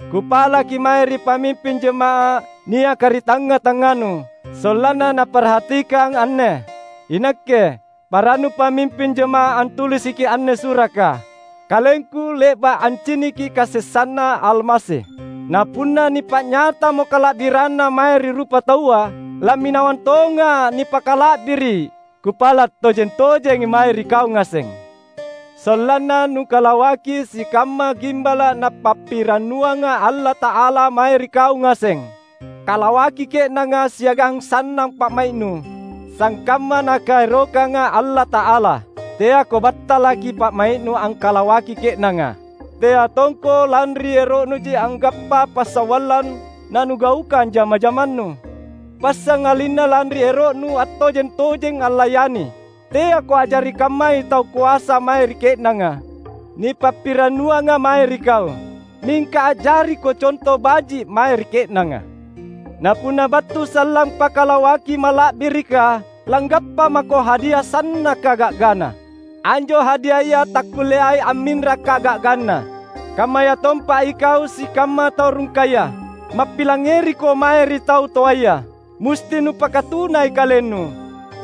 Kupalaki mae ri pamimping jama’ah niaka ri tangnga-tangnganu, sollanna naparhatikang anne. Inakke, parannu pamimping jama’ah, antulisiki anne suraka; kalengku le’ba’ anciniki kasessanNa Almasi. Na punna nipa’nyatamo kala’biranNa mae ri rupataua, lamminawang tonga’ nipakala’biri’. Kupala’ tojeng-tojengi mae ri kau ngaseng, sollanna nukalawaki sikamma gimbala’ Napappirannuanga Allata’ala mae ri kau ngaseng. Kalawaki ke’nanga siagang sannang pa’mai’nu, sangkamma Nakaerokanga Allata’ala. Teako battalaki pa’mai’nu angkalawaki ke’nanga. Tea tongko lanri ero’nuji anggappa passawallang nanugaukang jama-jamannu. Passangalinna lanri ero’nu attojeng-tojeng allayani. Teako a’jari kammai tau koasa mae ri ke’nanga, nipappirannuanga mae ri kau. Mingka a’jariko conto baji’ mae ri ke’nanga. Na punna battu sallang Pakalawaki Mala’birika, langgappa mako hadia sannaka ga’gana. Anjo hadiaya takkulleai amminra kaga’ganna. Kammayatompa ikau sikamma tau rungkaya. Mappilangngeriko mae ri tau toaya. Musti nupakatunai kalennu;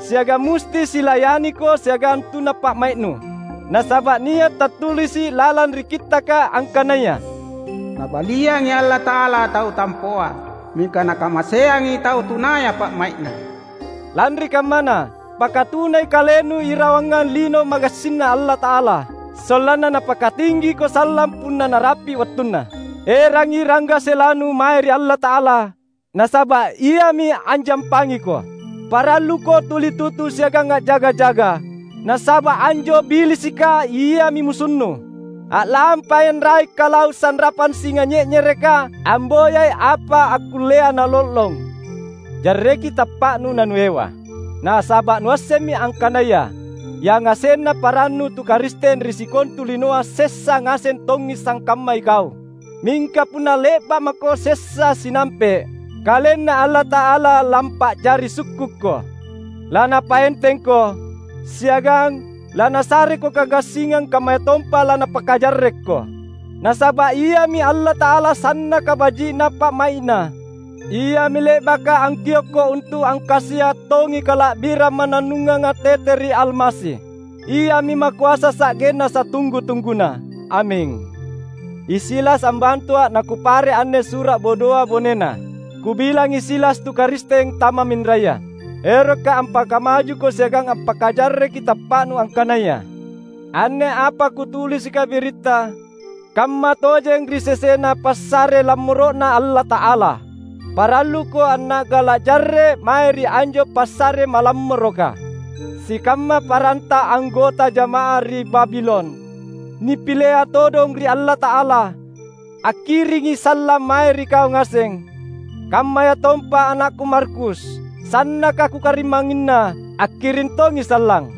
siagang musti silayaniko siagang tuna pa’mai’nu. Nasaba’ nia’ tattulisi’ lalang ri Kittaka angkanaya, "Nabaliangi Allata’ala tau tampoa, mingka Nakamaseangi tau tunaya pa’mai’na." Lanri kammana, pakatunai kalennu irawangang lino magassinNa Allata’ala. Sollanna Napakatinggiko sallang punna narapi’ wattunna. Erangi ranggaselanu mae ri Allata’ala, nasaba’ Iami anjampangiko. Paralluko tuli tutu siagang a’jaga-jaga! Nasaba’ anjo Billisika iami musunnu. A’lampai anrai’-kalau’ sanrapang singa nye’nyereka amboyai apa akkullea nalollong. Jarreki tappa’nu nanuewa. Nasaba’ nuassemmi angkanaya yangasenna parannu tu Karisteng ri sikontu linoa sessa ngaseng tongi sangkamma ikau. Mingka punna le’ba’ mako sessa sinampe’, KalenNa Allata’ala lampa’jari sukkukko. LaNapaentengko, siagang laNasareko kagassingang kammayatompa laNapakajarrekko. Nasaba’ Iami Allata’ala sannaka baji’na pa’mai’Na; Iami le’baka angkiokko untu’ angkasia’ tongi kala’birang mannannunganga tete ri Almasi. Iami makoasa sa’genna satunggu-tungguna! Aming! I Silas ambantua’ nakupare’ anne sura’ bodoa bonena. Kubilangi Silas tu Karisteng tamamminraya. Erokka’ ampakamajuko siagang ampakajarreki tappa’nu angkanaya anne apa kutulisika biritta kammatojeng ri sesena passare lammoro’Na Allata’ala. Paralluko anna’gala’ jarre’ mae ri anjo passare malammoroka. Sikamma paranta anggota jama’ah ri Babilon, nipilea todong ri Allata’ala, akkiringi sallang mae ri kau ngaseng. Kammayatompa anakku Markus, sannaka kukarimangnginna, akkiring tongi sallang.